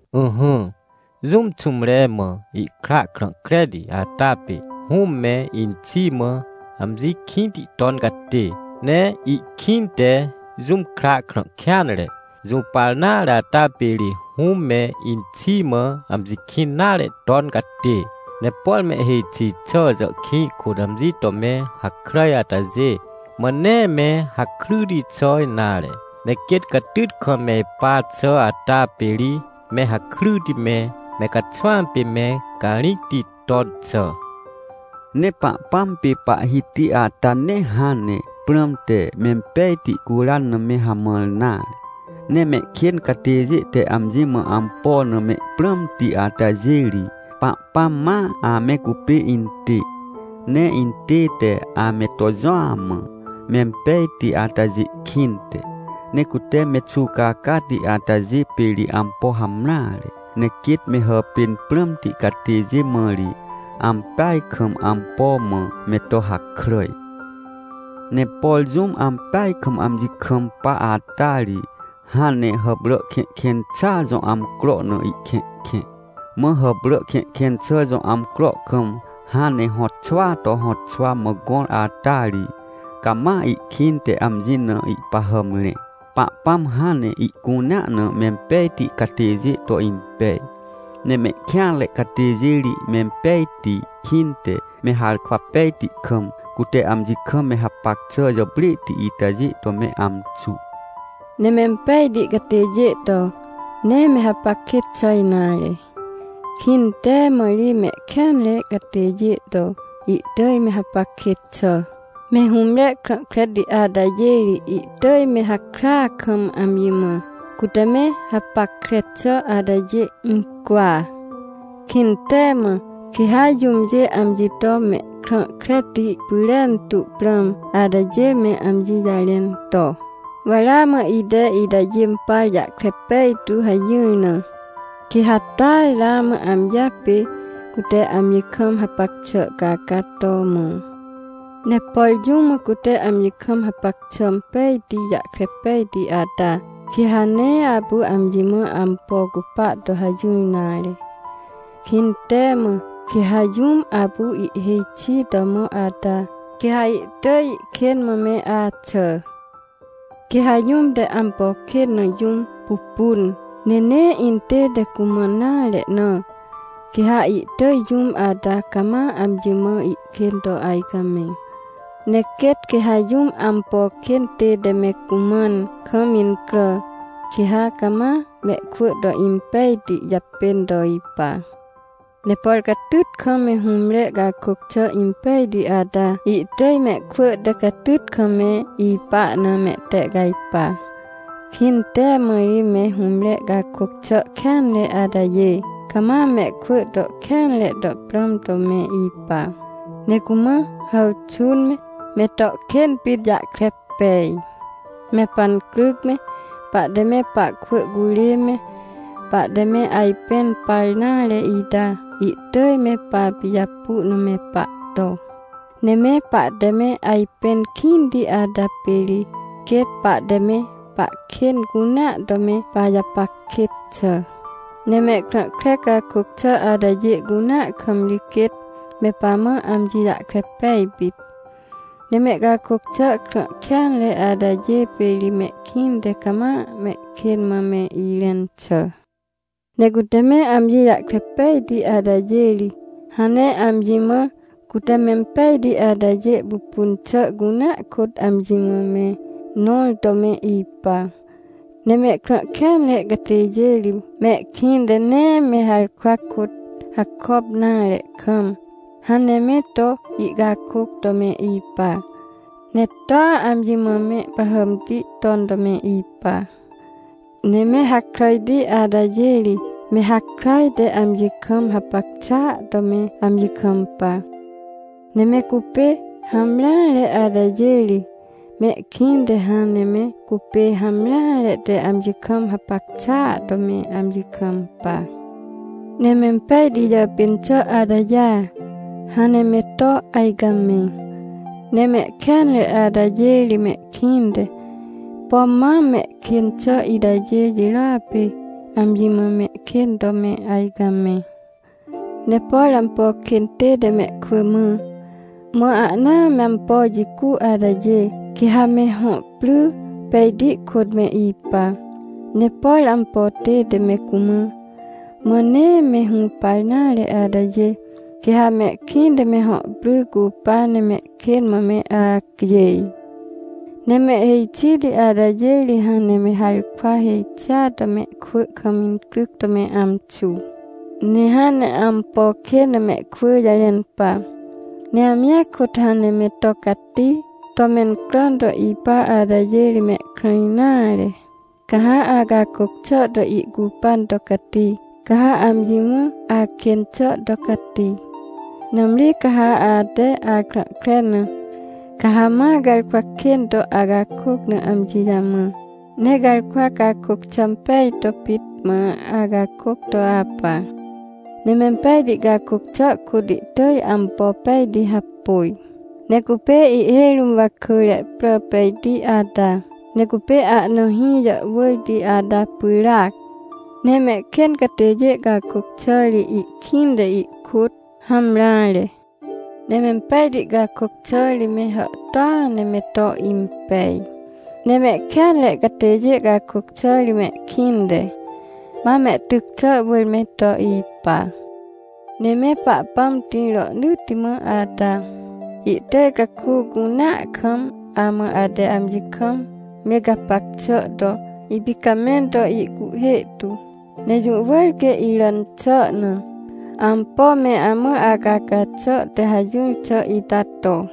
Ỹhỹ, jũm xũmre mã ihkra krã kreti ata pê, hũm me inxi mã amji kĩnti ton catê. Ne ihkĩnte jũm kra krã kêanre, jũpar nare ata pê ri hũm me inxi mã amji kĩn nare ton catê. Ne por mehhêj xi xà jàhkĩj kôt amji to me hakràj atajê, mã nee me hakryti xà nare. Ne quêt catyt kam me ipa xà ata pê ri me hakryti me, me caxwãm pê me carĩcti ton xà. Ne Pahpãm pê Pahhiti ata nee hãn ne prãm te mempejti curan na me hamãr nare. Ne mehkên catêjê te amji mã ampo na mehprãmti atajê ri, Pahpãm ma ame cupê intê, ne intête ame to jũa mã, mempejti atajê kĩnte. Ne cute me xuwcacati atajê pê ri ampo hamreare. Ne quêt me hàpên prãmti catêjê mã ri, ampeaj kam ampo mã me to hakràj. Ne por jũm ampeaj kam amji kampa ata ri, hãn ne hàprà kẽhkẽn xàa jõ amcro na ihkẽhkẽ. Mã hàprà kẽhkẽn xà jõ amcro kam hãn ne hõtxwaa to hõtxwa mã gõr ata ri, cama ihkĩnte amji na ihpahàm rẽ. Pahpãm hãn ne ihcunea na mempejti catêjê to impej. Ne mehkêanre catêjê ri mempejti kĩnte me harkwa pejti kam, cute amji kam me hapac xà jàprêhti itajê to me amxu. Ne mempejti catêjê to, nee me hapac kêt xà nare. Kĩntee mã ri mehkêanre catêjê to, ihtỳj me hapac kêt xà. Me hũmre krã kreti atajê ri, ihtỳj me hakrya kam amji mã, cute me hapackre xà atajê incwa. Kĩntee mã, quê ha jũmjê amji to mehkrã kreti pyrentu prãm atajê me amji jarẽn to: “Wa ramã ite itajê impar jahkre pejtu” hajỹr na, quê ha taa ramã amjia pê, cute amji kam hapac xà caca to mõ. Ne por jũm mã cute amji kam hapac xà impejti jahkre pejti ata, quê ha nee apu amji mã ampo cupa to hajỹr nare. Kĩntee mã quê ha jũm apu ihhêj xi to mõ ata, quê ha ihtỳj ihkên mã me axà. Quê ha jũm te ampo kên na jũm pupun, ne nee intête cumãn nare na, quê ha ihtỳj jũm ata cama amji mã ihkên to ajcamẽ. Ne quêt quê ha jũm ampo kên tête me cumãn kam incrà, quê ha cama mehkwỳ to impejti japên to ipa. Ne por catyt kam me hũmre cakôc xà impejti ata, ihtỳj mehkwỳ te catyt kam me ipa na mehtehcajpa. Kĩntee mã ri me hũmre cakôc xà kêanre atajê, cama mehkwỳ to kêanre to prãm to me ipa, ne cumã hàwxũn me, me to kên pit jahkre pej. Me pancryc me, pahte me pahkwỳ curê me, pahte me ajpẽn par nare ita, ihtỳj me papijapu na me pahto. Ne me pahte me ajpẽn kĩnti ata pê ri quêt pahte me pahkên cunea to me pajapac kêt xà. Ne mehkrã kre cakôc xà atajê cunea kam ri quêt me pamã amji jahkre pej pit. Ne mehcakôc xà krã kêanre atajê pê ri mehkĩnte cama mehkên mã me irẽn xà. Ne cute me amji jahkre pejti atajê ri, hãn ne amji mã, cute mempejti atajê pupun xà cunea kôt amji mã me nõr to me ipa. Ne mehkrã kêanre catêjê ri, mehkĩnte nee me harkwa kôt hakop nare kam, hãn ne me to ihcakôc to me ipa, ne toa amji mã mehpahàmti ton to me ipa. Ne me hakràjti atajê ri, me hakràj te amji kam hapac xàa to me amji kampa. Ne me cupê hamreare atajê ri, mehkĩnte hãn ne me cupê hamreare te amji kam hapac xàa to me amji kampa. Ne mempejti jàpên xà atajêa, hãn ne me to ajcamẽ. Ne mehkêanre atajê ri mehkĩnte, pom mam mehkên xà itajê jirôa pê, amji mã mehkên to me ajcamẽ. Ne por ampo kên tête mehkwỳ mã, mã ahnaa me ampo jicu atajê, quê ha me hõ pry pejti kôt me ipa. Ne por ampo tête me cumã, mã nee me hũpar nare atajê, quê ha mehkĩnte me hõ pry cupa ne mehkên mã me acjêj. Ne mehhêj xiti atajê ri hãn ne me harkwa hêj xia to mehkwỳ kam incryc to me amxu. Ne hãn ne ampo kên na mehkwỳ jarẽn pa, ne amjia kôt hãn ne me to cati to mencràn to ipa atajê ri mehkrã nare. Ca ha acakôc xà to ihcupan to cati, ca ha amji mã akên xà to cati. Nãmri ca ha ate akrã kre na, ca ha ma garkwa kên to acakôc na amji jamã, ne garkwa cakôc xà impej to pit mã acakôc to apa. Ne mempejti cakôc xà kôt ihtỳj ampo pejti hapôj, ne cupê ihhêj rũm wakỳre prà pejti ata, ne cupê ahna hĩ jàhwỳrti ata pyràac. Ne mehkên catêjê cakôc xà ri ihkĩnte ihkôt hamreare. Ne mempejti cakôc xà ri me hàhtôa ne me to impej. Ne mehkêanre catêjê cakôc xà ri mehkĩnte, ma mehtyc xà wỳr me to ipa. Ne me Pahpãm tĩr rohnỳtti mã ata, ihtỳj caku cunea kam amã ate amji kam me gapac xà to ipicamẽn to ihcuhhê tu. Ne jũ wỳr quê iràn xà na, ampo me amã acaca xà te hajỹr xà ita to.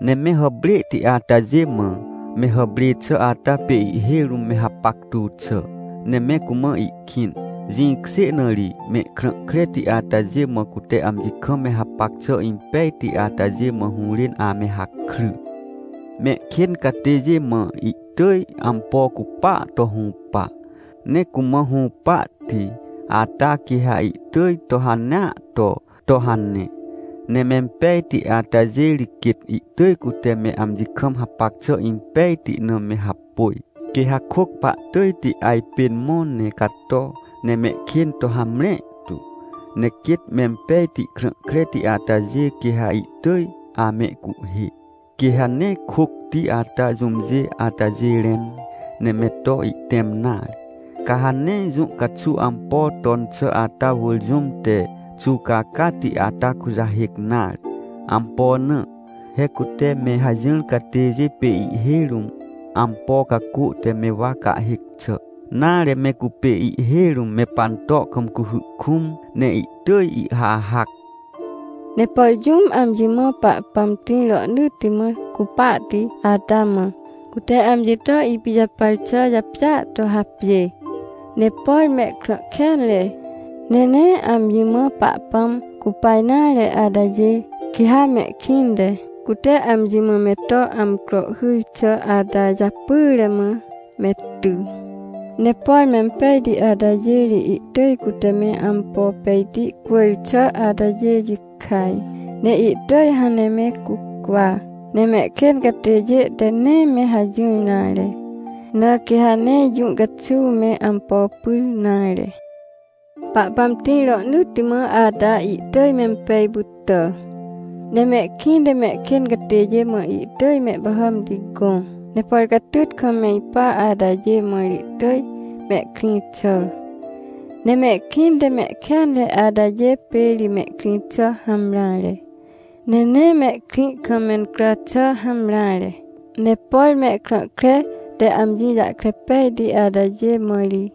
Ne me hàprêhti atajê mã, me hàprê xà ata pê ihhêj rũm me hapactu xà, ne me cumã ihkĩn. Jĩkjê na ri, mehkrã kreti atajê mã cute amji kam me hapac xà impejti atajê, mã hũrên ame hakry. Mehkên catêjê mã ihtỳj ampo cupaa to hũpa, ne cumã hũpahti ata quê ha ihtỳj to hanea to, to hane. Ne mempejti atajê ri quêt ihtỳj cute me amji kam hapac xà impejti na me hapôj. Quê ha kôc pahtỳjti ajpên mõ ne cato, ne mehkên to hamre tu. Ne quêt mempejti krã kreti atajê, quê ha ihtỳj amehcuhhê, quê ha nee kôcti ata jũmjê atajê rẽn, ne me to ihtẽm nare. Ca ha nee jũ caxuw ampo ton xà ata wỳr jũm te xuwcacati ata kujahêc nare. Ampo na? He cute me hajỹr catêjê pê ihhêj rũm ampo cacô te me wa cahhêc xà, nare, me cupê ihhêj rũm me panto kam cuhy kũm, ne ihtỳj ihhahac. Ne por jũm amji mã Pahpãm tĩr rohnỳtti mã cupahti ata mã, cute amji to ipijapar xà japjêa to hapjê. Ne por mehkrã kêanre, ne nee amji mã Pahpãm cupa nare atajê, quê ha mehkĩnte, cute amji mã me to amcro hyr xà ata japyre mã me ty. Ne por mempejti atajê ri ihtỳj cute me ampo pejti cwỳr xà atajê jikaj, ne ihtỳj hãn ne me cucwa. Ne mehkên catêjê te nee me hajỹr nare, na quê ha nee jũ caxuw me ampo pyr nare. Pahpãm tĩr rohnỳtti mã ata ihtỳj mempej pytà. Ne mehkĩnte mehkên catêjê mã ihtỳj mehpahàmti gõ. Ne por catyt kam me ipa atajê mã ri ihtỳj mehkrĩ xà. Ne mehkĩnte mehkêanre atajê pê ri mehkrĩ xà hamreare, ne nee mehkrĩ kam mencrà xà hamreare. Ne por mehkrã kre te amji jahkre pejti atajê mã ri,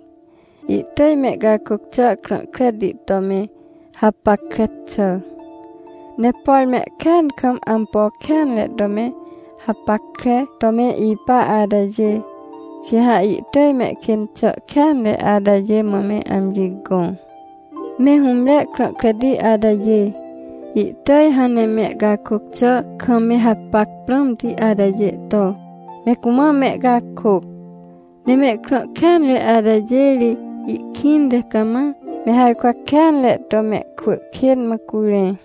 ihtỳj mehcakôc xà krã kreti to me hapackre xà. Ne por mehkêan kam ampo kêanre to me hapackre to me ipa atajê, quê ha ihtỳj mehkên xà kêanre atajê mã me amji gõ. Me hũmre krã kreti atajê, ihtỳj hãn ne mehcakôc xà kam me hapac prãmti atajê to, me cumã mehcakôc. Ne mehkrã kêanre atajê ri ihkĩnte cama me harkwa kêanre to mehkwỳ kên mã curẽ.